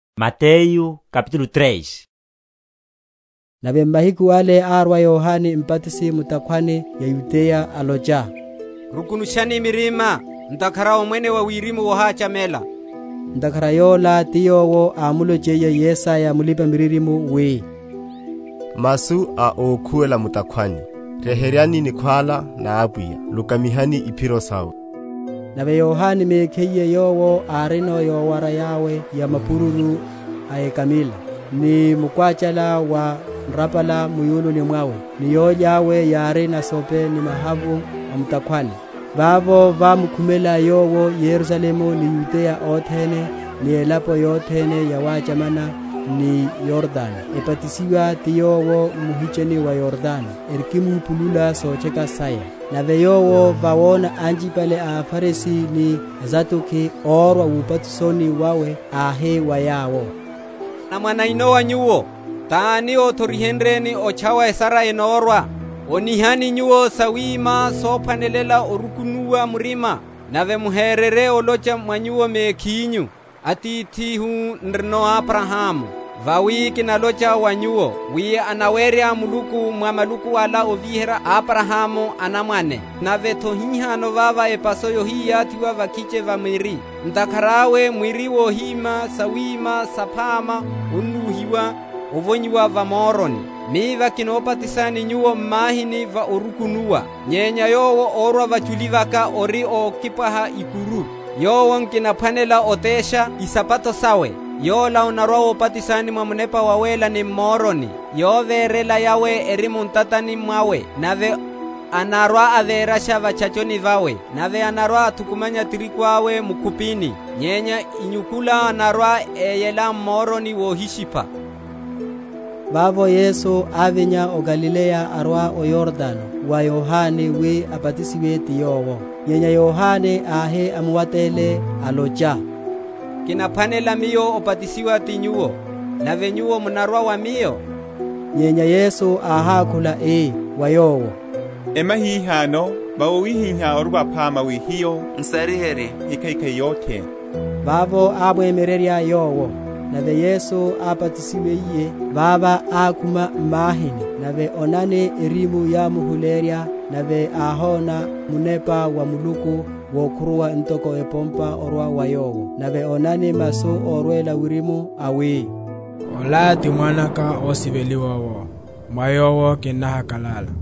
Yohane Mbatisi. Nave, m’mahiku ale árwa Yohane Mbatisi, mu’takhwani ya Yudeya, alocha, Rukunushani mirima, ntakhara Omwene wa Wirimu wohachamela. Ntakhara yola ti yowo ámlonchiye Yesaya mulipa‐miririmo, wi, Masu a ókhuwela mu’takhwani, Ryeheryani nikhwála na Apwiya, Lukamihani iphiro sawe. Nave Yohane mekhiye yowo árino yowara yawe ya mapururu a ekamila, ni mukwáchala wa nrapala mu’yununi mwawe; ni yólya yawe yári nasope ni mahavu a mu’takhwani. Vavo vámkhumela yowo Yerusalemu, ni Yudeya othene, ni elapo yothene yawáchamana ni Yordano; ebatisiwa ti yowo m’muhicheni wa Yordano, erikimupulula sotcheka saya. Nave yowo vawona anchipale a aFarisi ni a aSaduki órwa wubatisoni wawe, áhi wa yawo, Anamwane a enowa nyuwo, tani othorihenryeni otchawa esara enamórwa? Onihani nyuwo sawima sophwanela orukunuwa murima: nave muhererye olocha mwa nyuwo mekhinyu, Atithihu n’rino Abrahamu; vawi kinalocha wa nyuwo wi anawerya Muluku mwa maluku ala ovíherya Abrahamu anamwane. Nave’tho hihano vava epaso yohiyathiwa va’khiche va miri; ntakhara awe mwiri wohima sawima saphama onúhiwa ovonyiwa va moroni. Miva kinobatisani nyuwo m’mahini va orukunuwa; nyenya Yowo órwa vachuli vaka, ori okipwaha ikuru, yowo nkinaphwanela otesha isapato sawe: Yola anarwa‐obatisani mwa Munepa Wawéla ni m’moroni: yovérela yawe eri mu ntatani mwawe, nave anarwa‐avérasha va’tchachoni vawe; nave anarwa‐athukumanya tirigu awe mu’khupini, nyenya inyukula anarwa‐eyela m’moroni wohishipha. Obatisiwa wa Yesu. Vavo Yesu ávinya o Galileya arwa o Yordano, wa Yohane, wi abatisiwe ti yowo. Nyenya Yohane áhi amuwatele, alocha, Kinaphwanela miyo obatisiwa ti Nyuwo, nave Nyuwo munarwa wa miyo? nyenya Yesu áhákhula, ii wa yowo, Emya hihano: vawi wawihihá ori waphama wi hiyo n’sariherye ekhaikhai yothene. Vavo ámwemyererya Yowo. Nave Yesu, ábatisiwiye, vava ákhuma m’mahini: nave onani, erimu yámuhuleyerya, nave áhona Munepa wa Muluku wókhuruwa ntoko epompa orwa va Yowo; nave onani masu órwela wirimu awi, Ola ti Mwanaka osiveliwa Owo, mwa Yowo Kinnahakal’ala.